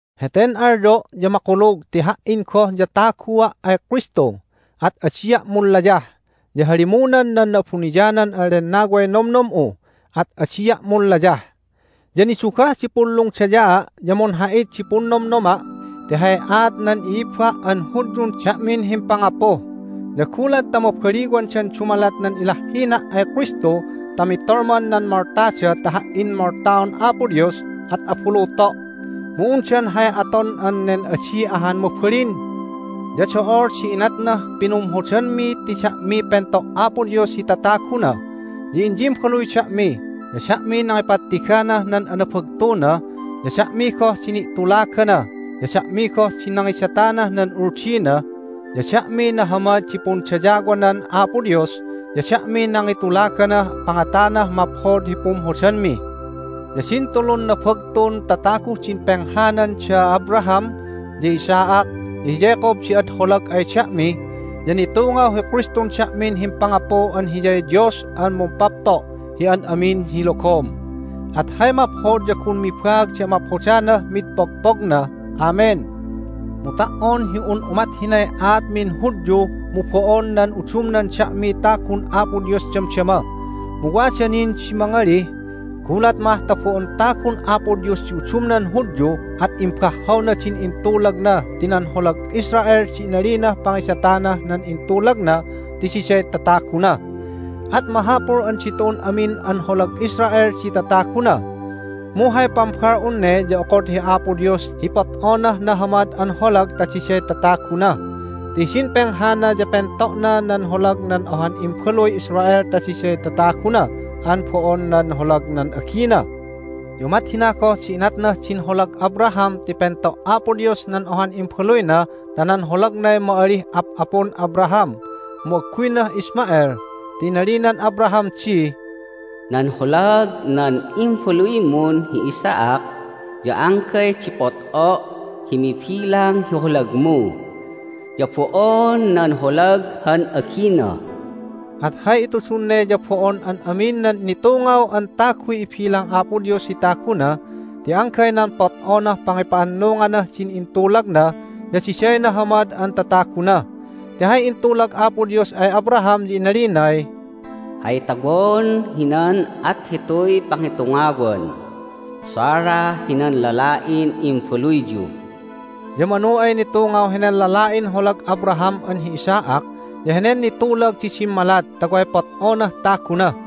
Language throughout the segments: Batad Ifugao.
Heten alyo' ya makulug ti ha"in goh ya tagua' ay Kristu, at adia' munlayah, ya halimunan nan Na'abuniyanan an Lennaway nomnom'u, at adia' munlayah. Ya nidugah di punlungdayaa', ya munha'it di punnomnoma' ti hay aat nan i'ibba' an Hudyun da'min himpangapu. Ya gulat ta mabaliwandan dumalat nan ilahhina' ay Kristu ta mitolman nan moltada ta ha"in moltaon Apo Dios at abuluto'. Mu undan hay aton an nen adi ahan mabalin. Ya do'ol di inatnah pinumhodanmi ti da'miy pento' Apo Dios hi tataguna. Ya inyimbaluy da'mi, ya da'miy nangipattignah nan anabagtuna, ya da'mi goh di ni'tulagana, ya da'mi goh di nangidatanah nan Uldina, ya da'miy nahamad di pundayawanan Apo Dios, ya da'miy nangitulaganah pangatanah maphod hi pumhodanmi. Ya din tulun nabagtun tataguh din penghanan da Abraham, ya hi Isaac, ya hi Jacob di ad holag ay da'mi, ya nitungaw hi Kristun da'min himpangapu an Hiyay Dios an mumpapto' hi an amin hi logom. At hay maphod ya gun mibaag di amaphodanah mid pogpogna! Amen! Mu ta"on hi un umat hinay aatmin Hudyu mu bo'on nan udumnan da'miy tagun Apo Dios damdama. Mu wada nin di mangalih, "Gulat mah ta bo'on tagun Apo Dios di udumnan Hudyu at imbahhawna din intulagna ti nan holag Israel di inalinah pangidatanah nan intulagna ti diday tataguna. At mahapul an ditu'un amin an holag Israel di tataguna!" Mu hay pambal'un ne ya okod hi Apo Dios hi pot'onah nahamad an holag ta diday tataguna. Ti hidin penghana ya pento'na nan holag nan ohan imbaluy Israel ta diday tataguna an bo'on nan holag nan agina. Ya umat hina goh di inatnah din holag Abraham ti pento' Apo Dios nan ohan imbaluyna ta nan holagnay ma'alih ap'apun Abraham, mu agguynah Ishmael. Ti inalinan Abraham di, "Nan holag nan imbaluymun hi Isaac ya anggay di pot'o' hi mibilang hi holagmu, ya bo'on nan holag han agina." At hay itudun ne ya bo'on an amin nan nitungaw an taguy ibilang Apo Dios hi taguna, ti anggay nan pot'onah pangipa'annunganah din intulagna, ya diday nahamad an tataguna. Ti hay intulag Apo Dios ay Abraham ya inalinay, "Hay tawon hinan at hituy pangitungawan Sarah hinan lala'in imbaluyyu." Ya manu ay nitungaw henen lala'in holag Abraham an hi Isaac ya henen nitulag di dimmalat ta way pot'onah taguna.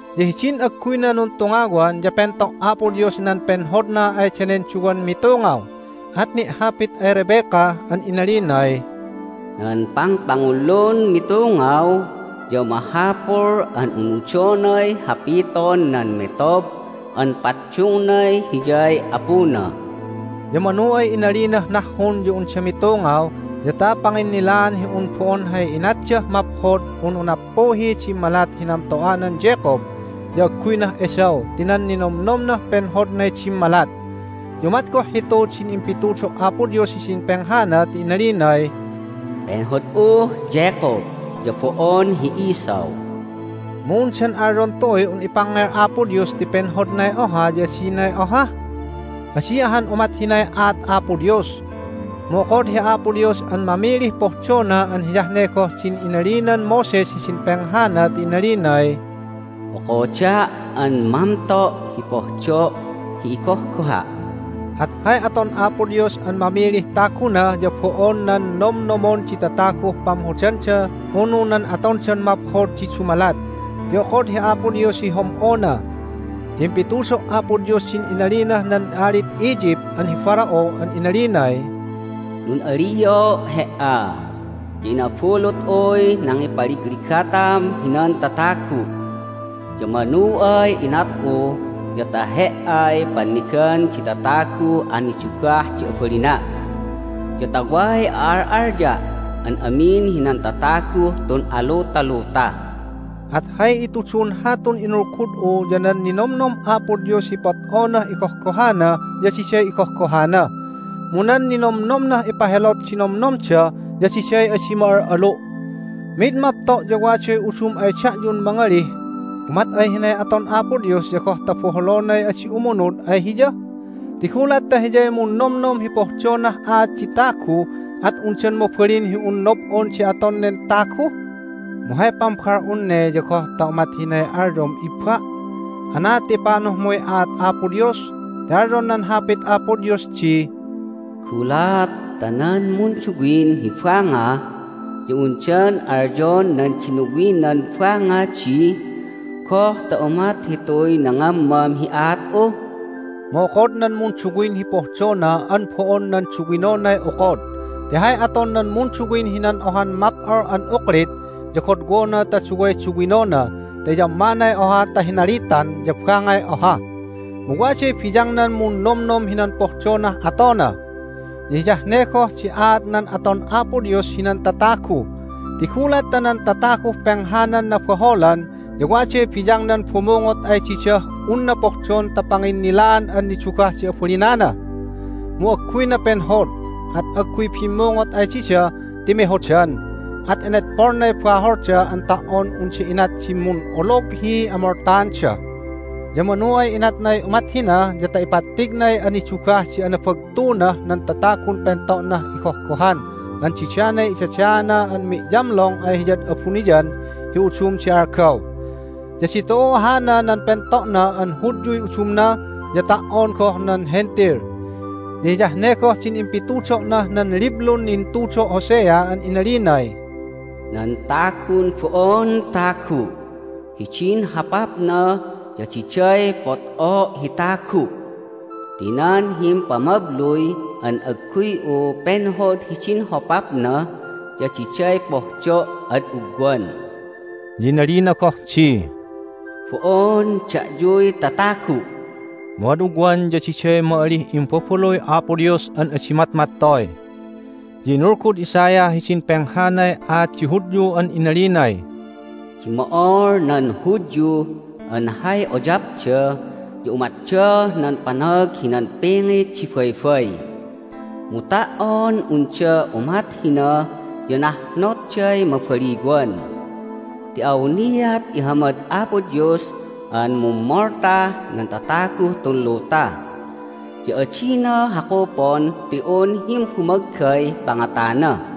Ya hidin agguyna nuntungawan ya pento' Apo Dios nan penhodna ay danen duwan mitungaw, at ni'hapit ay Rebecca an inalinay, "Nan pangpangullun mitungaw ya mahapul an unudonay hapiton nan metob an paddungnay hiyay apuna." Ya manu ay inalinah nahhun ya unda mitungaw ya ta panginnilaan hi un bo'on hay inatdah maphod unu nappuhiy dimmalat hi namto'anan Jacob, ya agguynah Esau ti nan ninomnomnah penhodnay dimmalat. Ya umat goh hitu din impitudo' Apo Dios hidin penghana ti inalinay, "Penhod'uh Jacob, ya bo'on hi Esau." Mu undan alyon tu'uy un ipangngel Apo Dios ti penhodnay oha ya adinay oha? Adi ahan umat hinay aat Apo Dios! Mu okod hi Apo Dios an mamilih pohdona an hiyah ne goh din inalinan Moses hidin penghana ti inalinay, "Okoda' an mamto' hi pohdo' hi igohgoha'." At hay aton Apo Dios an mamilih taguna ya bo'on nan nomnomon di tataguh pamhodanda unu nan atondan maphod di dumalat, ti okod hi Apo Dios hi hom'ona. Ya impitudo' Apo Dios din inalinah nan alid Egypt an hi Pharaoh an inalinay, "Nun'alio' he"a, ya inabulut'uy nangipaligligatam hinan tatagu', ya manu ay inat'u ya ta he"ay pannigan di tataguh anidugah di abalina', ya ta way a'al'alya' an amin hinan tataguh tun alutaluta." At hay itudun hatun inulgud'u ya nan ninomnom Apo Dios hi pot'onah igohgohana ya diday igohgohana. Mu nan ninomnomnah ipahelot di nomnomda ya diday adi ma'al'alu'. Mid mapto' ya waday udum ay da'yun mangalih, "Umat ay hinay aton Apo Dios ya goh ta boholonay adi umunud ay Hiya? Ti gulat ta Hiyay munnomnom hi pohdonah aat di tagu at undan mabalin hi un nob'on di aton nen tagu?" Mu hay pambal'un ne ya goh ta umat hinay alyom, ibba'? Anaad ta ipanuhmuy aat Apo Dios? Ti alyon nan Hapit Apo Dios di, "Gulat ta nan munduwin hi banga ya undan alyon nan dinuwinan banga di, Goh ta umat hituy nangammam hi aat'u?" Mu okod nan munduwin hi pohdona an bo'on nan duwinonay okod! Ti hay aton nan munduwin hinan ohan map'ol an uklit ya godwona ta duway duwinona ta iyammanay oha ta hinalitan ya bangay oha. Mu waday biyangnan munnomnom hinan pohdonah atona! Ya hiyah ne goh di aat nan aton Apo Dios hinan tatagu. Ti gulat ta nan tataguh penghanan nabaholan ya waday biyangnan bumungot ay didah unna pohdon ta panginnilaan an nidugah di abalinana. Mu agguyna penhod, at agguy bimmungot ay dida ti mehodan, at inedpolnay baholda an ta"on unda inat di mun'olog hi amoltaanda. Ya manu ay inatnay umat hina ya ta ipattignay anidugah di anabagtunah nan tatagun pento'nah igohgohan an didanay idadaana an mi'yamlong ay Hiyad abuniyan hi udum di algaw. Ya ditu'u hana nan pento'na an Hudyuy udumna, ya ta"on goh nan Hentil. Ya hiyah ne goh din impitudo'nah nan liblun intudo' Hosea an inalinay, "Nan tagun bo'on tagu' hidin hopapna ya diday pot'o' hi tagu' ti nan himpamabluy an agguy'u penhod hidin hopapna ya diday pohdo' ad ugwan." Ya inalina goh di, "Bo'on da'yuy tatagu'!" Mu ad ugwan ya diday ma'alih imbabaluy Apo Dios an adi matmattoy. Ya inulgud Isaiah hidin penghanay aat di Hudyu an inalinay, "Dimmo'ol nan Hudyu an hay uyapda ya umatdah nan panag hinan pingit di baybay. Mu ta"on unda umat hina ya nahnotday mabaliwan Ti awniat ihamad Apo Dios an mummoltah nan tataguh tun luta, ya adina hakupon ti un himbumaggay pangatana."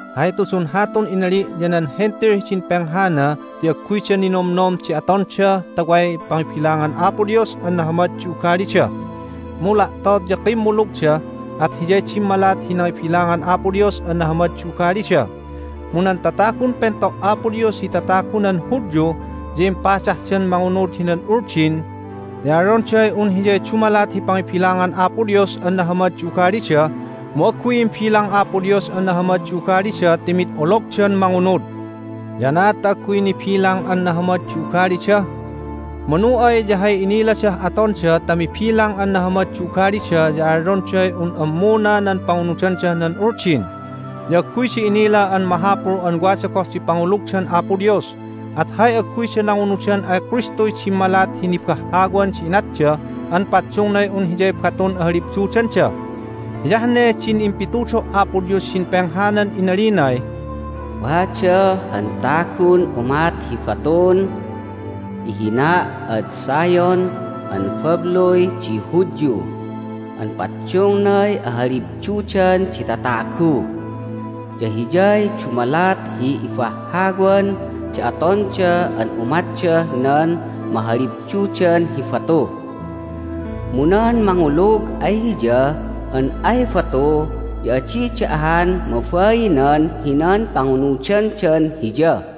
Hay itudun hatun inali' ya nan Hentil hidin penghana ti agguyda ninomnom di atonda ta way pangibilangan Apo Dios an nahamad di ugalida. Mu la'tot ya kimmulugda, at hiyay dimmalat hi nangibilangan Apo Dios an nahamad di ugalida. Mu nan tatagun pento' Apo Dios hi tatagunan Hudyu ya impadahdan mangunud hinan Uldin, ti alyonday un hiyay dumalat hi pangibilangan Apo Dios an nahamad di ugalida, mu agguy imbilang Apo Dios an nahamad di ugalida ti mid ologdan mangunud. Ya anaad ta agguy nibilang an nahamad di ugalida? Manu ay ya hay iniladah atonda ta mibilang an nahamad di ugalida ya alyonday un ammuna nan pangunudandah nan Uldin, ya agguyda inila an mahapul an wada goh di pangulugdan Apo Dios! At hay agguyda nangunudan ay Kristuy dimmalat hi nibahhawan di inatda an paddungnay un hiyay batun ahalibdudanda. Hiyah ne din impitudo' Apo Dios hidin penghanan inalinay, "Wada han tagun umat hi batun ihina' ad Zion an babluy di Hudyu an paddungnay ahalibdudan di tatagu, ya Hiyay dumalat hi ibahhawan di atonda an umatdah nan mahalibdudan hi batu. Mu nan mangulug ay Hiya an ay batu ya adida ahan mabainan hinan pangunudandan Hiya."